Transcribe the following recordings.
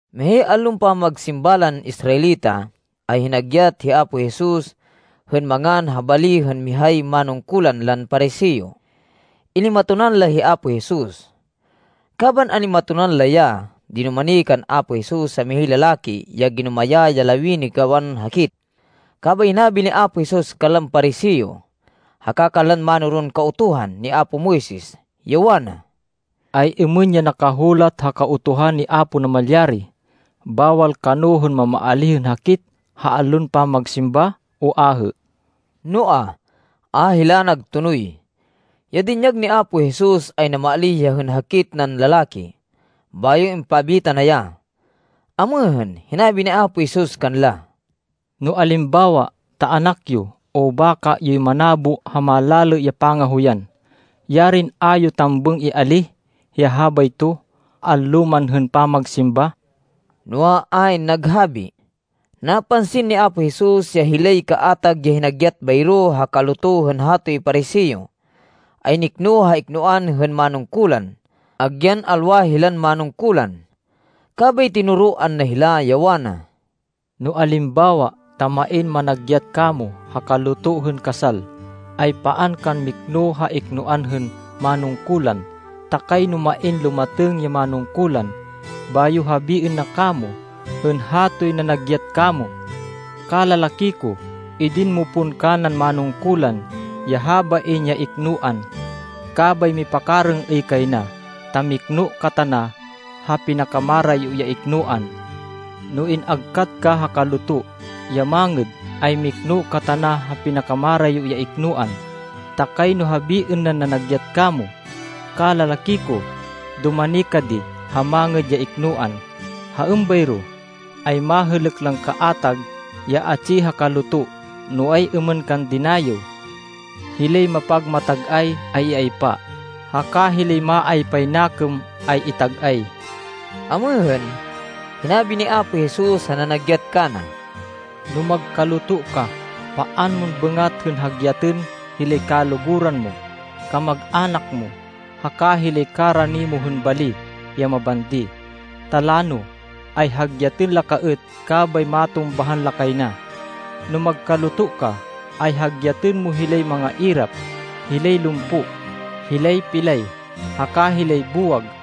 Mihay allon pamagsimba lan Israelita, ay hinagyat hi Apo Jesus hên mangan ha bali hên mihay manungkulan lan Pariseo. Inimatonan la hi Apo Jesus. Kaban an-imatonan la ya, dinumani kan Apo Jesus ya mihay lalaki ya ginumayá ya lawini gawan hakit. Kabay hinabi ni Apo Jesus kanlan Pariseo haka kanlan mánoron Kautuhan ni apo Moises, ya wana, “Ay-êmên ya nakahulat ha Kautuhan ni Apo Namalyari? Bawal kano hên mamaalíh hên hakit ha allon pamagsimba o ahê?” Noa, a hila nagtonoy. Ya dinyag ni Apo Jesus ay namaalíh ya hên hakit nan lalaki, bayo impabita na ya. Amêhên, hinabi ni Apo Jesus kanla, “No alimbawa ta anak yo, o baka yoy manabo ha malalê ya pangahoyan, yarin a yo tambêng ialih ya habayto, allo man hên pamagsimba?” Noa, ayn naghabi. Napansin ni Apo Jesus ya hilay kaatag ya hinagyat bayro ha kaluto hên hatoy Pariseo, ay nikno ha iknoan hên manungkulan agyan alwa hilan manungkulan. Kabay tinoroan na hila, ya wana, “No alimbawa ta main managyat kamo ha kaluto hên kasal, ay paan kan mikno ha iknoan hên manungkulan, ta kayno main lumatêng ya manungkulan, bayo habiên na kamo hên hatoy nanagyat kamo, ‘Kalalaki ko, idin mo pon kanan manungkulan ya habain ya iknoan.’ Kabay mipakarêng-êy kay na, ta mikno ka tana ha pinakamarayo ya iknoan. No in-agkat ka ha kaluto, ya mangêd, ay mikno ka tana ha pinakamarayo ya iknoan, ta kayno habiên nan nanagyat kamo, ‘Kalalaki ko, dumani ka di ha mangêd ya iknoan.’ Ha êmbayro ay, mahêlêk lan kaatag ya atsi ha kaluto no ay-êmên kan dinayêw. Hilay mapagmatag-ay, ay iaypa, haka hilay maaypay nakêm ay itag-ay.” Amêhên, hinabi ni Apo Jesus ha nanagyat kana, “No magkaluto ka, paan mon bêngat hên hagyatên hilay kaluguran mo, kamag-anak mo haka hilay karani mo hên bali ya mabandi. Ta lano, ay hagyatên la ka êt, kabay matumbahan la kay na. No magkaluto ka, ay hagyatên mo hilay mangairap, hilay lumpo, hilay pilay, haka hilay buwag.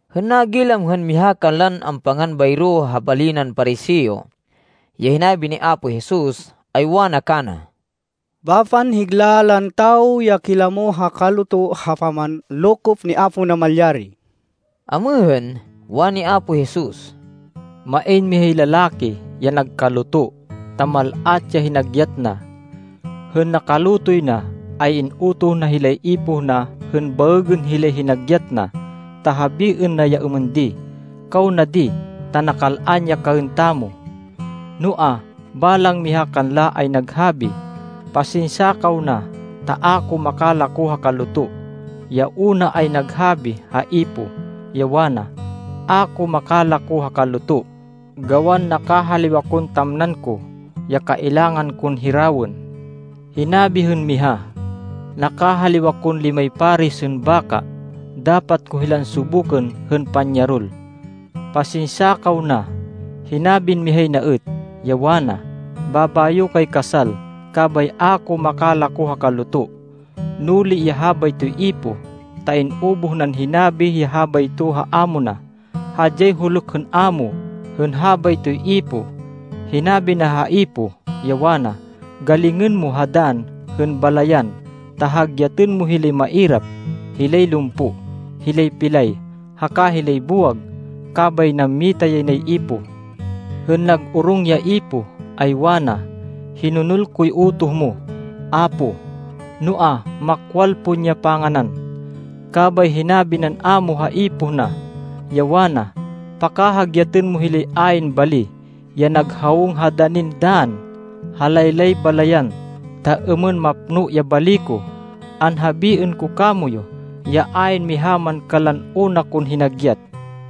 Hên nagilam hên miha kanlan ampangan bayro ha bali nan Pariseo ya hinabi ni Apo Jesus, ay wana kana, “Bapan higla lan tawo ya kilamo ha kaluto ha pamanlokop ni Apo Namalyari.” Amêhên, wani Apo Jesus, “Main mihay lalaki ya nagkaluto, ta mal-at ya hinagyat na. Hên nakalutoy na, ay in-utoh na hilay ipoh na hên baêgên hilay hinagyat na, ta habiên na ya êmên di, ‘Kaw na di, ta nakal-an ya kaên tamo.’ Noa, balang miha kanla ay naghabi, ‘Pasinsya kaw na, ta a ko makalako ha kaluto.’ Ya una ay naghabi ha ipoh, ya wana, ‘A ko makalako ha kaluto, gawan nakahaliw akon tamnan ko, ya kailangan kon hirawên.’ Hinabi hên miha, ‘Nakahaliw akon limay paris hên baka. Dapat ko hilan subukên hên panyarol. Pasinsya kaw na.’ Hinabin mihay na êt, ya wana, ‘Babayo kay kasal, kabay a ko makalako ha kaluto.’ Nuli ya habaytoy ipoh, ta in-ubuh nan hinabi ya habayto ha amo na. Hadyay huluk hên amo hên habaytoy ipoh. Hinabi na ha ipoh, ya wana, ‘Galingên mo ha dann hên balayan, ta hagyatên mo hilay mairap, hilay lumpo, hilay pilay, haka hilay buwag.’ Kabay nammita yay nay ipoh. Hên nag-orong ya ipoh, ay wana, ‘Hinonol koy utoh mo, Apo. Noa, makwal pon ya panganan.’ Kabay hinabi nan amo ha ipoh na, ya wana, ‘Pakahagyatên mo hilay ayn bali, ya nag hawong ha danin dann ha laylay balayan, ta êmên mapno ya bali ko. Anhabiên ko kamoyu ya ayn miha man kanlan una kon hinagyat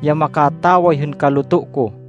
ya makataway hên kaluto ko.’”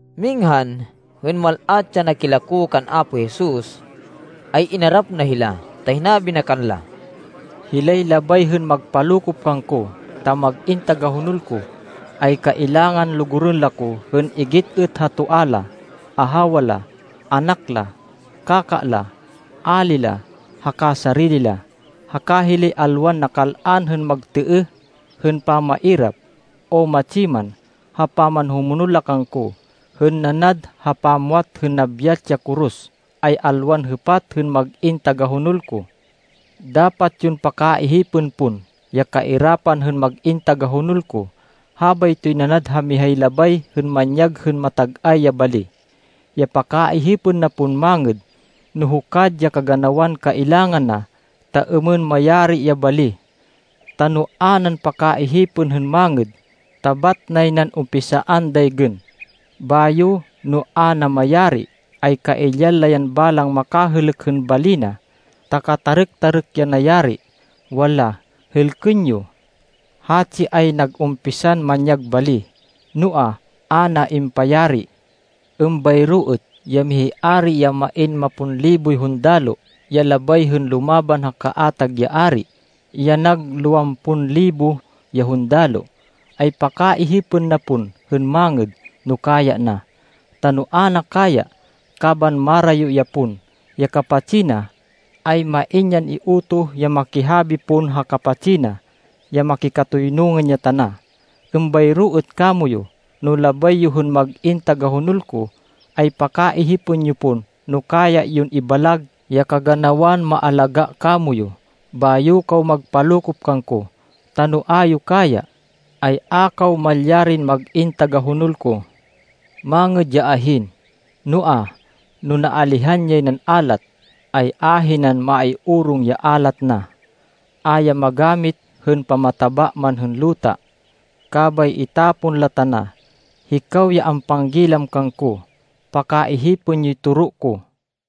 Minghan, hên mal-at ya nakilako kan Apo Jesus, ay inarap na hila, ta hinabi na kanla, “Hilay labay hên magpalokop kangko, ta mag-in tagahonol ko, ay kailangan lugurên la ko hên igit êt ha toa la, ahawa la, anak la, kaka la, ali la, haka sarili la. Haka hilay alwan nakal-an hên magtêêh hên pamairap, o matsi man, ha pamanhumonol la kangko hên nanad ha pamwat hên nabyat ya koros, ay alwan hêpat hên mag-in tagahonol ko. Dapat yon pakaihipên pon ya kairapan hên mag-in tagahonol ko. Habaytoy nanad ha mihay labay hên manyag hên matag-ay ya bali, ya pakaihipên na pon mangêd, no hukad ya kaganawan kailangan na, ta êmên mayari ya bali. Ta, no a nan pakaihipên hên mangêd, ta bat nay nan umpisaan daygên, bayo, no a na mayari, ay kailyan la yan balang makahêlêk hên bali na, ta katarêk-tarêk ya nayari. Wanla, ‘Hêlkên yo! Hatsi ay nag-umpisan manyag bali, noa, a na impayari.’ Êmbayro êt ya mihay ari ya main mapon liboy hundaloh, ya labay hên lumaban ha kaatag ya ari ya nag lowampon libo ya hundaloh, ay pakaihipên na pon hên mangêd no kaya na. Ta no a na kaya, kaban marayo ya pon ya kapatsi na, ay main yan iutoh ya makihabi pon ha kapatsi na ya makikatoynungan ya tana. Êmbayro êt kamoyu no labay yo hên mag-in tagahonol ko, ay pakaihipên yo pon no kaya yon ibalag ya kaganawan maalagá kamoyu, bayo kaw magpalokop kangko. Ta no a yo kaya, ay a kaw malyarin mag-in tagahonol ko.” “Mangêd ya ahin. Noa, no naalihan yay nan alat, ay ahinan maiorong ya alat na. A ya magamit hên pamataba man hên luta. Kabay itapon la tana. Hikaw ya ampanggilam kangko, pakaihipên yoy toro ko!”